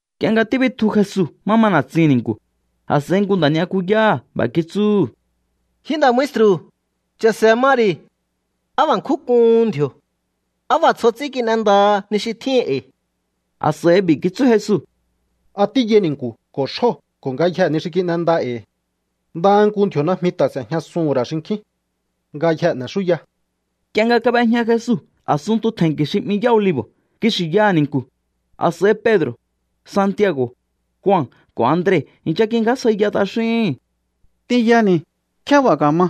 Nk'ie nga tíbitju Jesu má ma na̱tsihi̱n ni̱nku̱, a̱s'a̱i nku nda̱ ni'yakuyáha̱ b'a̱ kitsúhu̱: —Ji nda̱ maestru̱, cha̱se̱ ma ri̱. ¡Á b'a̱ nkjún k'uhun ndji̱o̱! ¡Á b'a̱ tsjo ts'ín kin'endaha ni xi tjíhin e̱i̱! A̱s'a̱i b'i̱ kitsú Jesu: —¿A tíyai ni̱nku̱ ko̱ xjóo̱ ko̱ ngayjee̱ ni xi kin'enda e̱i̱? Ndaha nku ndji̱o̱ najmi ta̱ s'e̱jñasuhu̱n ra̱ xinkjín. Ngayjee̱ n'e̱xúya. Nk'ie nga kab'ejña Jesu a̱sunntu tje̱nki̱ xi 'mi Yá Olivo̱ kixi̱ yaha̱ ni̱nku̱, a̱s'a̱i Pedro̱, Santiago̱, Jua ko̱ Andre i̱ncha kingjásjaiya t'axíhi̱n: —T'inyani̱, ¿nkjé b'a̱ ka̱ma?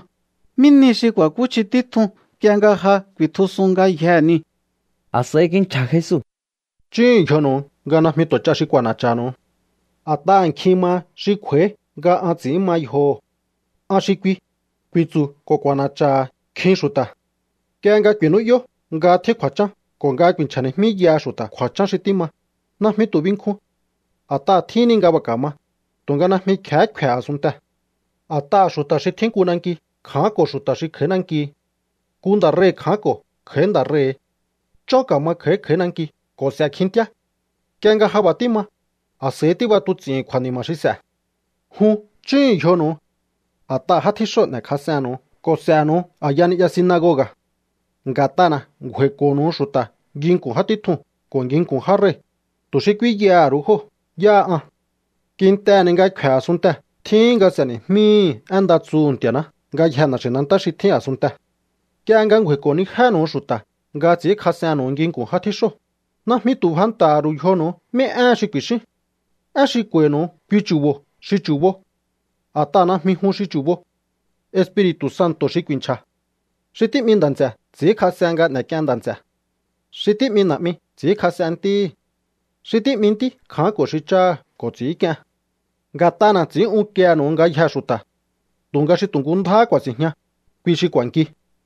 ¿Mí nihi xi ku̱a̱kúchji títjun nk'ie nga ja ku̱i̱tjusun ngayjee̱ niu̱? A̱s'a̱i kinchja̱ Jesu: —Chúhu̱un yjonu̱u nga najmi tu̱ ch'a xi k'u̱a̱na̱cha̱nu̱u. A̱t'aha̱ nkjin maha xi kj'u̱a̱í nga an ts'i̱ín ma yjoho̱. “An xi kui”, ku̱i̱tsu̱ ko̱ k'u̱a̱na̱cha̱ha̱ nkjin xu̱ta̱. ’Nk'ie nga ku̱i̱nú'yó nga tjín kju̱a̱chán ko̱ nga ku̱i̱nchja̱ni̱jmíyaha xu̱ta̱ kju̱a̱chán xi tíma, najmi tu̱ binkjun. A̱t'aha̱ tjíhin ni nga b'a̱ ka̱ma, tu̱nga najmi kje̱hé kfe̱ a̱sunntee̱. A̱t'aha̱ xu̱ta̱ xi tjín nku nanki kja̱ánko̱ xu̱ta̱ xi kj'a̱í nanki. Nku nda̱ rei̱ kja̱ánko̱ kj'a̱í nda̱ rei̱. Chón ka̱ma kj'a̱í kj'a̱í nankihi ko̱ s'e̱ kjintíá. Nk'ie nga ja b'a̱ tíma, a̱s'a̱ihí tíb'atuts'i̱hi̱n kju̱a̱ni̱ma̱ xi s'e̱. ’Jun chúhu̱un yjonu̱u. A̱t'aha̱ já tjíxóo̱ n'e̱kjas'ennu̱u ko̱ s'e̱nu̱u a̱ya ni'ya sinagoga̱. Nga̱t'ana̱ ngju̱a̱i̱ko̱ho̱nu̱u xu̱ta̱ nginku̱n já títjuu̱n ko̱ nginku̱n já rei̱, tu̱ xi k'úínyaha̱ ru̱u jóo̱ yáha an. Kintehe̱ ni nga kfe̱ a̱sunntee̱ tjíhin nga s'e̱ni̱jmíhi̱ én nda tsuhu̱ Nti̱a̱ná ngayjee̱ na̱xi̱nantá xi tjín a̱sunntee̱. Nk'ie nga ngju̱a̱i̱ko̱nijénu̱u xu̱ta̱ nga ts'i̱ínkjas'ennu̱u nginku̱n já tjíxóo̱, najmi tu̱ fanta̱ha̱ ru̱u yjonu̱u mí éhen xi ku̱i̱xíún. Én xi k'u̱a̱i̱nu̱u kui chu̱bo̱ xi chu̱bo, a̱t'aha̱ najmi jun xi chu̱bo. Espiri̱tu̱ Santo̱ xi ku̱i̱nchja̱. ’Xi tí'mi nda̱ nts'e̱ ts'i̱ínkjas'en nga n'e̱k'ien nda̱ nts'e̱. Xi tí'mi na̱'mi ts'i̱ínkjas'en ntíhi̱. Xi tí'mi ntí kja̱ánko̱ xi cháha̱ ko̱ ts'i̱ínk'ien. Nga̱t'ana̱ ts'i̱ín unkiehe̱nu̱u ngayjee̱ xu̱ta̱. Tu̱nga xi tu̱ nku ndjáhá ku̱a̱si̱njña, kui xi k'u̱a̱nki.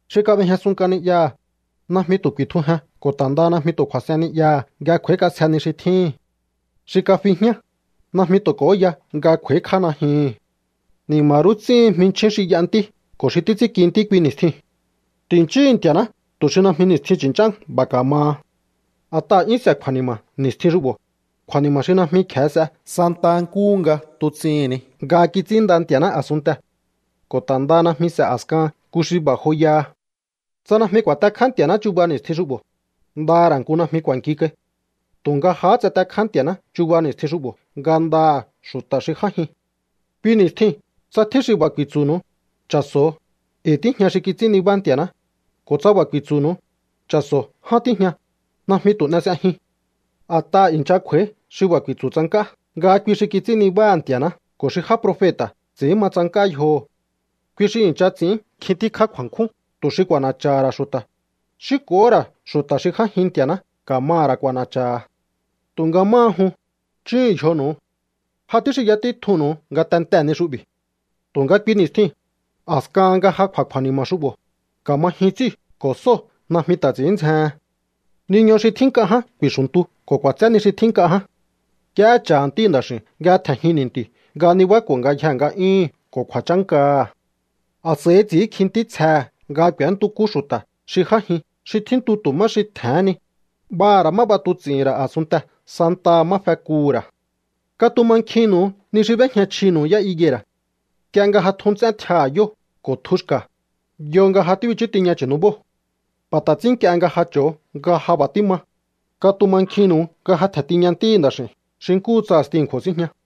Xi kab'ejñasun nk'a ni'yaha̱, najmi tu̱ ku̱i̱tjujen ko̱ ta̱ ndaha najmi tu̱ kju̱a̱s'en ni'yaha̱ nga kj'u̱a̱íkj'ásje ni xi tjíhi̱n. Xi kafi jñá, najmi tu̱ k'o̱óya nga kj'u̱a̱íkj'á najyuhu̱n. ’¡Ni̱ma̱ rú ts'íhin jminchjín xi y'a ntí ko̱ xi títs'ínki ntí kui ni̱stjiu̱n! Ti̱nchíhu̱u Nti̱a̱ná tu̱ xi najmi ni̱stjin chu̱nch'án b'a̱ ka̱maha. A̱t'aha̱ 'yún s'e̱ kju̱a̱ni̱ma̱ ni̱stjin xu'bo̱, kju̱a̱ni̱ma̱ xi najmi kje̱e s'e santa nkúhu nga tuts'ihi̱n ni nga kits'ínnda Nti̱a̱ná a̱sunntee̱. Ko̱ ta̱ ndaha najmi s'e̱ a̱skahan nku xi b'a̱ joyaha. Tsa najmi ku̱a̱tekjá Nti̱a̱ná chuba ni̱stjin xu'bo̱, nda ra̱ nku najmi k'u̱a̱nki kai. Tu̱nga jahá tsatekjá Nti̱a̱ná chuba ni̱stjin xu'bo̱ ngandaha̱ xu̱ta̱ xi j'ájin. ’Kui ni̱stjiu̱n tsa tjín xi b'a̱ ku̱i̱tsu̱nu̱u: “Cha̱so̱o, e̱i̱ tíjña xi kits'ín nibá Nti̱a̱ná”, ko̱ tsa b'a̱ ku̱i̱tsu̱nu̱u: “Cha̱so̱o, ján tíjña”, najmi tu̱ n'e s'ejiun. A̱t'aha̱ i̱ncha kj'u̱a̱í xi b'a̱ ku̱i̱tsu̱ tsank'á nga kui xi kits'ín nibáha̱ Nti̱a̱ná ko̱ xi já profeta̱ ts'i̱ín ma tsank'á yjoho̱. Kui xi i̱ncha ts'i̱ín nkjin tíkjá kju̱a̱nkjún tu̱ xi k'u̱a̱na̱cha̱ha̱ ra̱ xu̱ta̱, xi ko̱hó ra̱ xu̱ta̱ xi j'ájin Nti̱a̱ná ka̱maha̱ ra̱ k'u̱a̱na̱cha̱ha̱. Tu̱nga máha jun, chúhu̱un yjonu̱u. Jahá tíxinya títjunnu̱u ngatentee̱ ni xu'bi̱. ’Tu̱nga kui ni̱stjiu̱n, a̱skahan nga ja kj'u̱a̱ kju̱a̱ni̱ma̱ xu'bo̱, ka̱ma jyun ts'íu̱ ko̱ sóo̱ najmi ta̱ ts'i̱ín ndzjehen. Niñu xi tjín nk'a ján ku̱i̱xu̱ntu ko̱ k'u̱a̱tsé ni xi tjín nk'a ján. Nk'iehé cha̱ Ntíhi̱ Nda̱x'i̱u̱n nga tje̱njin ni̱nti̱u̱ nga nibáko̱ ngayjee̱ nga'yúhu̱n ko̱ kju̱a̱chánkaha̱. A̱s'a̱i ts'i̱ínkji ntítsjehe̱ nga k'u̱éntukú xu̱ta̱ xi j'ájin xi tjíntu tu̱ má xi tje̱hén ni, b'aha̱ ra̱ má b'atuts'i̱hi̱n ra̱ a̱sunntee̱ santaha má fekuhu̱ ra̱. ’Katumankjinnu̱u ni xi b'éjña chjinu̱u yá higuera̱. Nk'ie nga ja tju nts'én tjiaha̱ yóo̱ ko̱ tjuhu̱ xka̱, yo nga ja tíbichú tiña chu̱nubóo̱. B'a̱ ta̱ ts'ín nk'ie nga ja cho̱o nga ja b'a̱ tíma, katumankjinnu̱u nga ja tje̱n tiña Ntíhi̱ Nda̱x'i̱u̱n xi nkúhu tsa a̱sti a̱nkju̱o̱ síjña.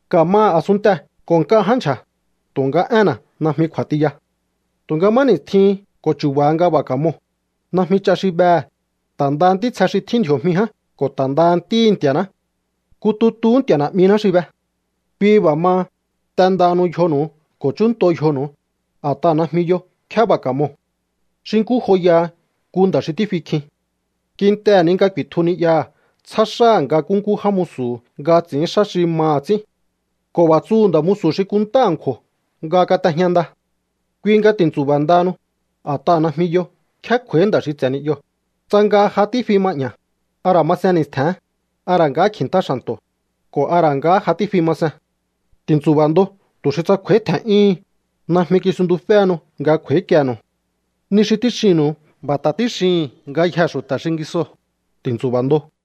Ka̱maha̱ a̱sunntee̱ ko̱ nk'a ján ndyja̱, tu̱nga énna̱ najmi kj'u̱a̱ tiya. ’Tu̱nga má ni̱stjin ko̱ chu̱ba̱ nga b'a̱ ka̱moo̱, najmi ch'a xi behe̱, ta̱ ndaha ntítsje xi tjín ndji̱o̱jmi ján ko̱ ta̱ ndaha Ntíhi̱ Nti̱a̱ná. Nku tutuhú Nti̱a̱ Na̱'miná xi be. Kui b'a̱ maha, t'endahanu yjonu̱u ko̱ chúnnto yjonu̱u, a̱t'aha̱ najmi yo nkjé b'a̱ ka̱moo̱. ’Xi nkú joyaha nku nda̱ xi tífi kjin. Kintehe̱ ni nga ku̱i̱tju ni'yaha̱ tsjá xáha̱ nga kúnkú já musu̱hu̱ nga ts'i̱ín xá xi maha̱ ts'ín. Ko̱ b'a̱ tsuhu̱ nda̱ musu̱ xi kunntá a̱nkju̱o̱ nga kat'ejña nda. Kui nga ti̱ntsu̱ba̱ ndahanu, a̱t'aha̱ najmi yo nkjé kj'u̱a̱í nda̱ xi ts'e̱ ni'yoo̱, tsa nga ja tífi ma 'ña̱, a ra̱ masen ni̱stje̱n, a ra̱ nga kji̱ntá xa̱nto̱, ko̱ a ra̱ nga ja tífi ma sen. Ti̱ntsu̱ba̱ ndo tu̱ xi tsa kj'u̱a̱í tje̱n'yúhun, najmi kisuntuféhenu nga kj'u̱a̱íkienu̱u. Ni xi tíxinnu̱u, b'a̱ ta̱ tíxihi̱n ngayjee̱ xu̱ta̱ xingisoo̱: ¡Ti̱ntsu̱ba̱ ndo!